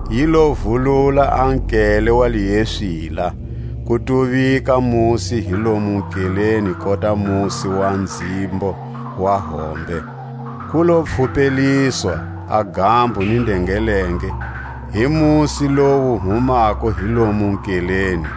Yi lo vulula a nkele wa lieswila; ku tuvika musi hi lomu nkeleni kota musi wa nzhimbo wa hombe; ku lo pfhupeliswa a gambo ni ndengelenge hi musi lowu wu humako hi lomu nkeleni.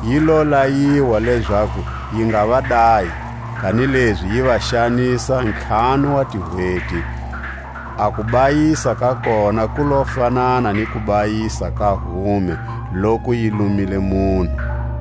Yi lo layiwa lezaku yi nga va dayi, kanilezi yi va xanisa ntlhanu wa tihweti; a kubayisa ka kona ku lo fanana ni kubayisa ka hume loku yi lumile munhu.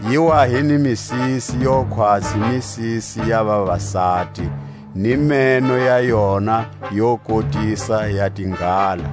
Yi wa hi ni misisi yo khwatsi misisi ya vavasati, ni meno ya yona yo kotisa ya tinghala.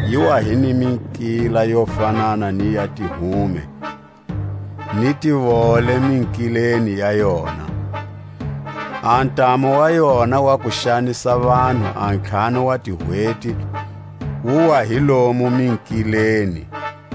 Yi wa hi ni minkila yo fanana ni ya tihume, ni tivole minkileni ya yona; a ntamu wa yona wa ku xanisa vanhu a ntlhanu wa tihweti wu wa hi lomu minkileni.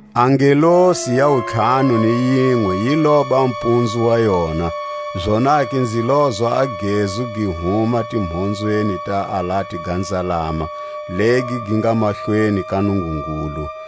A ngelosi ya wuntlhanu ni yinwe yi loba mpunzu wa yona, zonake nzi lozwa a gezu gi huma timhonzweni ta alati ga nzalama legi gi nga mahlweni ka Nungungulu,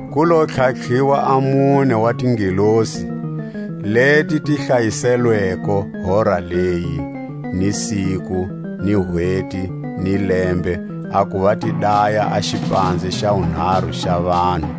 Ku lo tlhatlhiwa a mune wa tingelosi, leti ti hlayiselweko hora leyi, ni siku, ni hweti, ni lembe, a kuva ti daya a xipanze xa wunharu xa vanhu.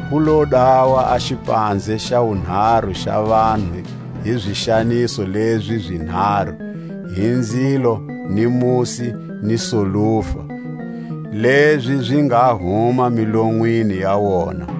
Ku lo dawa a xipanze xa wunharu xa vanhu hi zixaniso lezi zinharu, hi nzilo ni musi ni solufa, lezi zi nga huma milonwini ya wona.